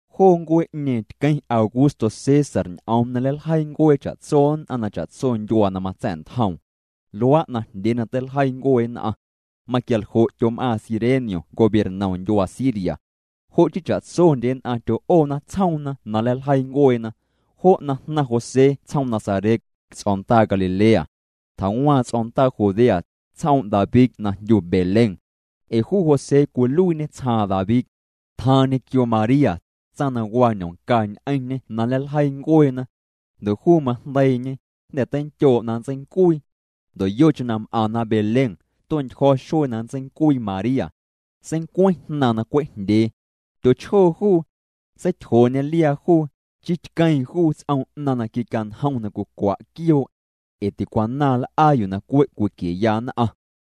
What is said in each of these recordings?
Joo ncuee'ñeeⁿ tqueⁿ Augusto César ñ'oom na nleiljeii ncuee cha'tso nn'aⁿ na cha'tso ndyuaa na matsa̱'ntjoom. Luaa' najndyee na teiljeii ncuee nn'aⁿ. Maquialjo' tyom'aaⁿ Cirenio gobiernom ndyuaa Siria. Jo' chii cha'tsondye nn'aⁿ tyo'oona tsjoomna na nleiljeii ncueena. Jo' jnaⁿ José tsjoom Nazaret, ts'o̱ndaa Galilea. Tjawaaⁿ ts'o̱ndaa Judea, tsjoom' David na jndyu Belén. Ee juu José cwiluiiñê tsjaaⁿ David. Tjaaⁿ ñequio María, tsaⁿ na waa ñomca ñ'eⁿñê na nleiljeii ncueena. Ndo' juu majndeiiñe, jnda̱ teinndyoo' na nntseincuii. Ndo' yocheⁿ na m'aⁿna Belén, tue'ntyjo̱ xuee na nntseincuii María. Seincueⁿ jnaaⁿ na cwe' jndyee. Tyochjoo juu. Seityjooñê liaa juu, chii tqueeⁿ juu ts'om 'naⁿ na quicanjom na cwicwa' quioo'. Ee ticwanaaⁿ l'aa yuu na cwe' cwiquieya nn'aⁿ.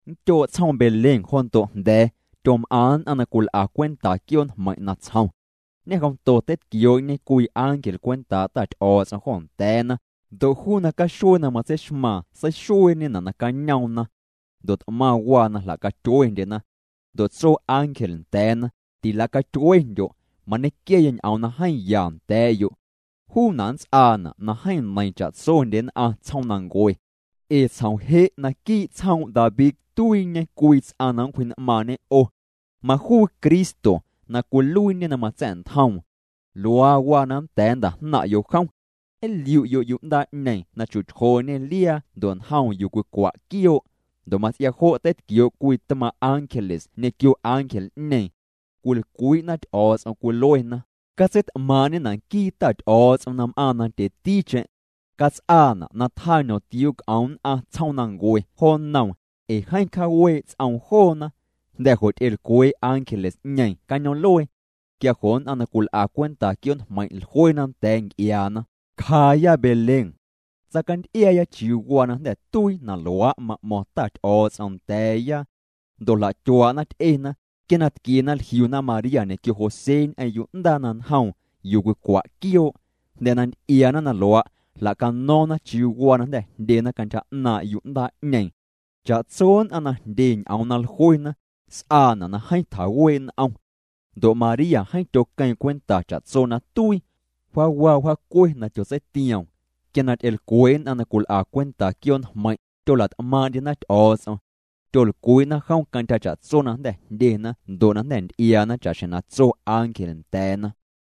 Ndyoo' tsjoom Belén jo ndo' jnda̱a̱, tyom'aⁿ nn'aⁿ na cwil'a cwenta quioo' njmeiⁿ' natsjom. Ñejomto teitquioo'ñe cwii ángel cwentaa' Ta Ty'o̱o̱ts'om jo nda̱a̱na, ndo' juu nacaxuee na matseixmaaⁿ seixueeñena' nacañoomna. Ndo' t'maⁿ waa na jla'catyuendyena. Ndo' tso ángel nda̱a̱na: —Tila'catyuendyo', mañequiaya ñ'oom na jeeⁿ ya nda̱a̱'yo'. Juuna' nnts'aana' na jeeⁿ neiiⁿ cha'tsondye nn'aⁿ tsjoomnancue. Ee tsjom je' naquii' tsjoom' David tuiiñe cwii ts'aⁿ na nncwji'n'maaⁿñe 'o. Majuu Cristo na cwiluiiñê na matsa̱'ntjoom. Luaa waa na nnda̱a̱ nnta'jnaⁿ'yo' jom. Nliu'yo' yu'ndaa'ñeeⁿ na chu'tyjooñê liaa ndo' njoom yuu cwicwa' quioo'. Ndo' mats'ia jo' teitquioo' cwii tmaaⁿ' ángeles ñequio ángel'ñeeⁿ. Cwilcwii'na Ty'o̱o̱ts'om. Cwiluena: Catseit'maaⁿ'ñena' nquii Ta Ty'o̱o̱ts'om na m'aaⁿ nandyeticheⁿ. Cats'aana' na tjaa ñomtiuu c'om nn'aⁿ tsjoomnancue jo nnoom, ee jeeⁿ cjaawee' ts'oom joona. Jnda̱ jo' ty'elcwee' ángeles'ñeeⁿ cañoom'luee. Quia jo' nn'aⁿ na cwil'a cwenta quioo' njmeiⁿ' jluena nda̱a̱ nc'iaana: —Cjaaya Belén. Tsaacanty'iaaya chiuu waa na jnda̱ tuii na luaa' ma'mo̱ⁿ Ta Ty'o̱o̱ts'om nda̱a̱ya. Ndo' jla'tyuaa'na, ty'ena. Quia na tquiena, jliuna María ñequio José ñ'eⁿ yu'ndaa na njoom yuu cwicwa' quioo'. Jnda̱ na nty'iaana na luaa', jla'cano̱o̱ⁿna chiuu waa na jnda̱ jndyena cantyja 'naaⁿ' yu'ndaa'ñeeⁿ. Cha'tso nn'aⁿ na jndye ñ'oom na jluena, s'aana' na jeeⁿ tjawee' n'om. Ndo' María jeeⁿ tyoqueeⁿ cwenta cha'tso na tuii. Wjaawa, wjaacue na tyotseitioom. Quia na ty'elcwee' nn'aⁿ na cwil'a cwenta quioo' njmeiⁿ', tyola't'maaⁿ'ndyena Ty'o̱o̱ts'om. Tyolcwii'na jom cantyja cha'tso na jnda̱ jndyena ndo' na jnda̱ nty'iaana cha'xjeⁿ na tso ángel nda̱a̱na.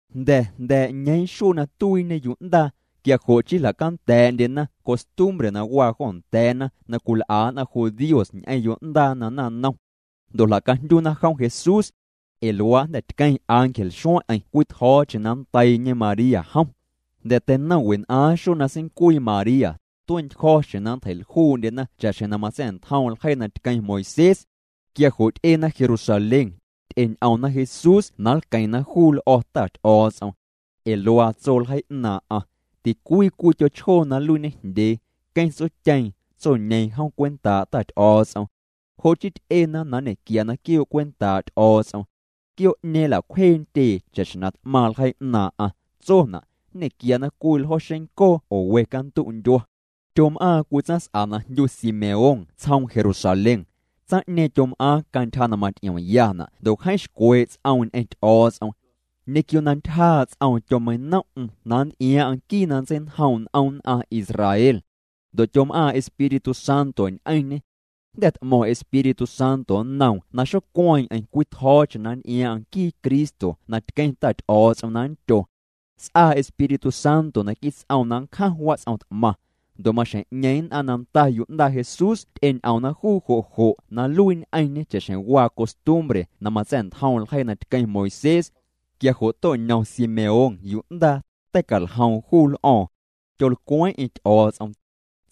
Jnda̱ jnda̱a̱' ñeeⁿ xuee na tuiiñe yu'ndaa, quia jo' chii jla'canda̱a̱'ndyena costumbre na waa jo nda̱a̱na na cwil'a nn'aⁿ judíos ñ'eⁿ yo'ndaa na naⁿnom. Ndo' jla'cajndyuna jom Jesús. Ee luaa' jnda̱ tqueⁿ ángel xueⁿ'eⁿ cwii tjo̱o̱cheⁿ na nndeiiñe María jom. Jnda̱ teinom wen'aaⁿ xuee na seincuii María, tue'ntyjo̱ xjeⁿ na nntjei'ljuu'ndyena cha'xjeⁿ na matsa̱'ntjom ljeii na tqueⁿ Moisés. Quia jo' ty'ena Jerusalén, ty'eñ'omna Jesús na nlqueⁿna juu l'o̱ Ta Ty'o̱o̱ts'om. Ee luaa tso ljeii 'naaⁿ'aⁿ: “Ticwii cwii tyochjoo na nluiiñejndyee, queⁿ tsotyeeⁿ, tsoñeeⁿ jom cwentaa' Ta Ty'o̱o̱ts'om.” Jo' chii ty'ena na nñe'quiana quioo' cwentaa' Ty'o̱o̱ts'om. Quioo'ñeeⁿ nla'cwjee ntyee cha'xjeⁿ na t'maⁿ ljeii 'naaⁿ'aⁿ. Tsona': nñequiana cwii ljo xencoo oo we cantu' ndyua. Tyom'aaⁿ cwii tsaⁿs'a na jndyu Simeón tsjoom Jerusalén. Tsaⁿ'ñeeⁿ tyom'aaⁿ cantyja na maty'iomyana' ndo' jeeⁿ xcwee' ts'oom ñ'eⁿ Ty'o̱o̱ts'om. Ñequio na ntyjaa' ts'oom tyomeinom'm na nnty'iaaⁿ'aⁿ nquii na nntseinjoom' n'om nn'aⁿ Israel. Ndo' tyom'aaⁿ Espíritu Santo ñ'eⁿñê. Jnda̱ t'mo̱ⁿ Espíritu Santo nnoom na xocueeⁿ'eⁿ cwitjo̱o̱cheⁿ na nnty'iaaⁿ'aⁿ nquii Cristo na tqueⁿ Ta Ty'o̱o̱ts'om na nndYo. S'aa Espíritu Santo naquii' ts'oom na nncjaⁿ wats'om t'maⁿ. Ndo' maxjeⁿ'ñeeⁿ nn'aⁿ na nda yu'ndaa Jesús ty'eñ'omna juu jo' jo' na nluii ñ'eⁿñê cha'xjeⁿ waa costumbre na matsa̱'ntjom ljeii na tqueⁿ Moisés. Quia jo' to'ñom Simeón yu'ndaa, tei'caljoom juu l'o̱o̱ⁿ. Tyolcweeⁿ'eⁿ Ty'o̱o̱ts'om.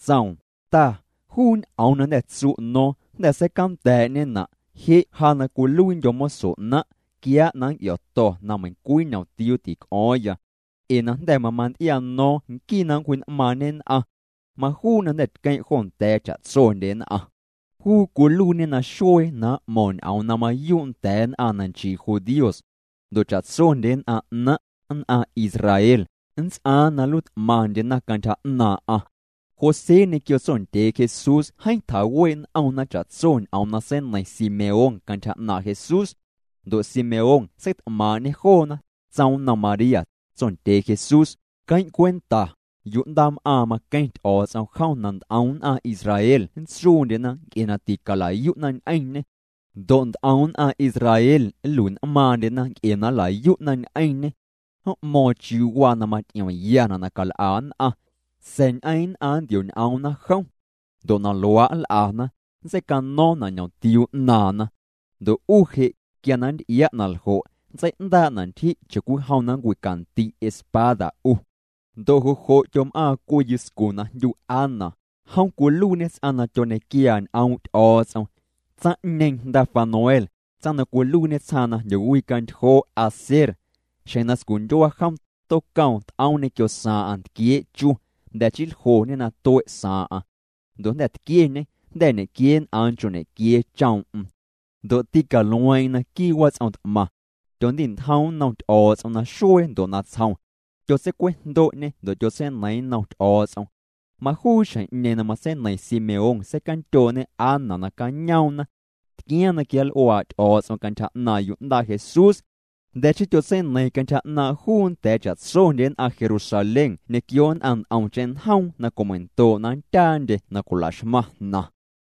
Tsoom: Ta, juu ñ'oom na jnda̱ tsu' no̱o̱ⁿ, jnda̱ seicanda̱a̱'ñena'. Je' ja na cwiluiindyo̱ moso 'naⁿ', quiaa' na nnc'io̱to̱ na meiⁿcwii ñomtiuu tic'o̱o̱ⁿya. Ee na jnda̱ mamanty'iano̱o̱ⁿ nquii na nncwji'n'maaⁿñe nn'aⁿ. Majuu na jnda̱ tqueⁿ' jo nda̱a̱ cha'tsondye nn'aⁿ. Juu cwiluiiñe naxuee na m'mo̱ⁿ ñ'oom na mayuu' nda̱a̱ nn'aⁿ na nchii judíos. Ndo' cha'tsondye nn'aⁿ 'naⁿ', nn'aⁿ Israel, nnts'aaⁿ na nluiit'maⁿndyena cantyja 'naaⁿ'aⁿ. José ñequio tsondyee Jesús jeeⁿ tjawee' n'omna cha'tso ñ'oom na seineiⁿ Simeón cantyja 'naaⁿ' Jesús. Ndo' Simeón seit'maaⁿ'ñê joona, tsoom nnom María, tsondyee Jesús: —Queⁿ' cwenta, yu'ndaam'aaⁿ, maqueⁿ Ty'o̱o̱ts'om jom na nt'om nn'aⁿ Israel nntsuundyena nc'e na ticala'yu'na ñ'eⁿñê. Ndo' nt'om nn'aⁿ Israel nlui'n'maaⁿndyena nc'e na nla'yu'na ñ'eⁿñê. M'mo̱o̱ⁿ chiuu waa na maty'iomyana' na cal'a nn'aⁿ. Sa̱a̱ ñ'eeⁿ' nn'aⁿ nntio'ñ'oomna jom. Ndo' na luaa' nl'ana, nntseicano̱o̱ⁿna' ñ'omtiuu 'naaⁿna. Ndo' 'u je', quia na nnty'ia' na ljo', nntsei'ndaa'na' ntyji' cha'cwijom na nncwicandi' espada 'u. Ndo' jo' jo' tyom'aaⁿ cwii yuscu na jndyu Ana, jom cwiluiiñê ts'aⁿ na tyoñequiaa ñ'oom' Ty'o̱o̱ts'om. Tsaⁿ'ñeeⁿ jnda Fanuel, tsaⁿ na cwiluiiñe tsjaaⁿ na jndyowicantyjoo' Aser. Xjeⁿ na scundyua jom tocoom, t'oom ñequio saaⁿ'aⁿ ntquiee' chu, jnda̱ chii ljoñê na tue' saaⁿ'aⁿ. Ndo' jnda̱ tquieñê, jnda̱ ñequieen'aaⁿ nchoo' ñequiee choom'm. Ndo' tîcalueeⁿ'eⁿ naquii' wats'om t'maⁿ. Tyondi'ntjoom nnom Ty'o̱o̱ts'om naxuee ndo' natsjom. Tyotseicwejndo'ñê ndo' tyotseineiiⁿ nnom Ty'o̱o̱ts'om. Majuu xjeⁿ'ñeeⁿ na matseineiⁿ Simeón, seicandyoo'ñe Ana nacañoomna. Tquiaaⁿ na quianl'uaa' Ty'o̱o̱ts'om cantyja 'naaⁿ' yu'ndaa Jesús. Jnda̱ chii tyotseineiiⁿ cantyja 'naaⁿ' juu nda̱a̱ cha'tsondye nn'aⁿ Jerusalén ñequio nn'aⁿ nt'omcheⁿ njoom na cwimeindoo' na nndyaandye na cwilaxmaⁿ jnaⁿ.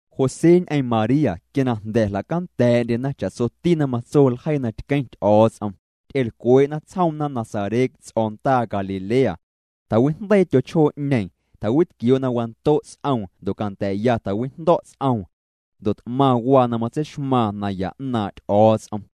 José ñ'eⁿ María quia na jnda̱ jla'canda̱a̱'ndyena cha'tsoti na matso ljeii na tqueⁿ Ty'o̱o̱ts'om, ty'elcwee'na tsjoomna Nazaret, ts'o̱ndaa Galilea. Tjawijndeii tyochjoo'ñeeⁿ, tjawitquioo' na wando' ts'oom ndo' canda̱a̱'ya tjawijndo̱' ts'oom. Ndo' t'maⁿ waa na matseixmaaⁿ naya 'naaⁿ' Ty'o̱o̱ts'om.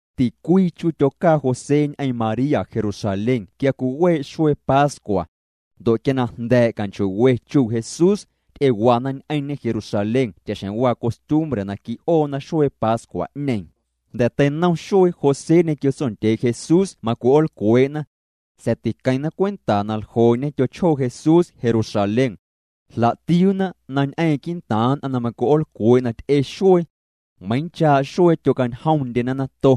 Ticwii chu tyocaa José ñ'eⁿ María Jerusalén quia cwiwee' xuee pascua. Ndo' quia na jnda̱a̱' canchoo'we chuu' Jesús, ty'ewana ñ'eⁿñê Jerusalén cha'xjeⁿ waa costumbre na qui'oona xuee pascua'ñeeⁿ. Jnda̱ teinom xuee, José ñequio tsondyee Jesús macwi'oolcwee'na. Sa̱a̱ tiqueⁿna cwenta na ljoo'ñe tyochjoo Jesús Jerusalén. Jla'tiuuna na ñ'eeⁿ quii'ntaaⁿ nn'aⁿ na macwi'oolcwee' na ty'e xuee. Meiiⁿchaa' xuee tyocañjomndyena nato.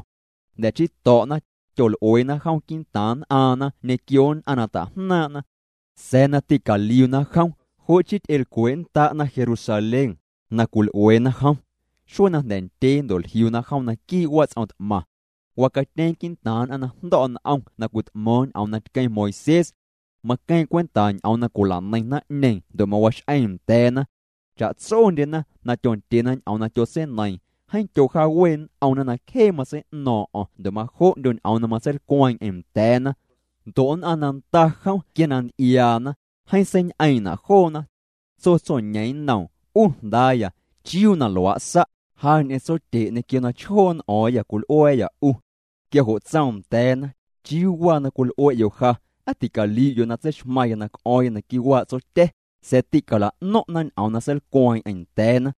Jnda̱ chii to̱'na, tyol'ueena jom quii'ntaaⁿ nn'aaⁿna ñequio nn'aⁿ na ta'jnaaⁿ'na. Sa̱a̱ na tîcaliuna jom, jo' chii ty'elcwee'nnda'na Jerusalén, na cwil'ueena jom. Xuee na jnda̱ ndyee, ndo' jliuna jom naquii' wats'om t'maⁿ. Wacatyeeⁿ quii'ntaaⁿ nn'aⁿ na jndo̱' n'om na cwit'mo̱o̱ⁿ ñ'oom na tqueⁿ Moisés. Maqueeⁿ cwenta ñ'oom na cwila'neiⁿ naⁿ'ñeeⁿ ndo' mawax'eeⁿ nda̱a̱na. Cha'tsondyena na tyondyena ñ'oom na tyotseineiiⁿ, jeeⁿ tyojaawee' n'omna na cjee matsei'no̱o̱ⁿ'o̱ⁿ ndo' majo'ndyo ñ'oom matseilcweeⁿ'eⁿ nda̱a̱na. Ndo' nn'aⁿ na nda jom quia na nty'iaana, jeeⁿ seiñ'eeⁿ'na' joona. Tso tsoñeeⁿ nnoom: —'U jndaaya, ¿chiuu na luaa' sa'? Ja ñ'eⁿ tsotye' ñequio na chjoo' n'o̱o̱ⁿyâ cwil'ua̱a̱yâ 'u. Quia jo' tsoom nda̱a̱na: —¿Chiuu waa na cwil'ue'yo' ja? ¿Aa ticaliu'yo' na tseixmaⁿya na c'o̱o̱ⁿya naquii' waa' Tsotya̱? Sa̱a̱ tîcala'no̱ⁿ'na ñ'oom na seilcweeⁿ'eⁿ nda̱a̱na.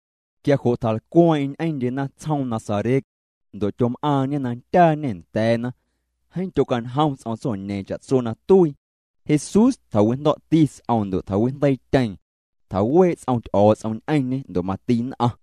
Quia jo' tjalcweeⁿ'eⁿ ñ'eⁿndyena tsjoom Nazaret. Ndo' tyom'aaⁿñê na ndyaañê nda̱a̱na. Jeeⁿ tyocañjom ts'om tsoñeeⁿ cha'tso na tuii. Jesús tjawijndo̱'ti ts'oom ndo' tjawijndeiityeeⁿ. Tjawee' ts'om Ty'o̱o̱ts'om ñ'eⁿñê ndo' mati nn'aⁿ.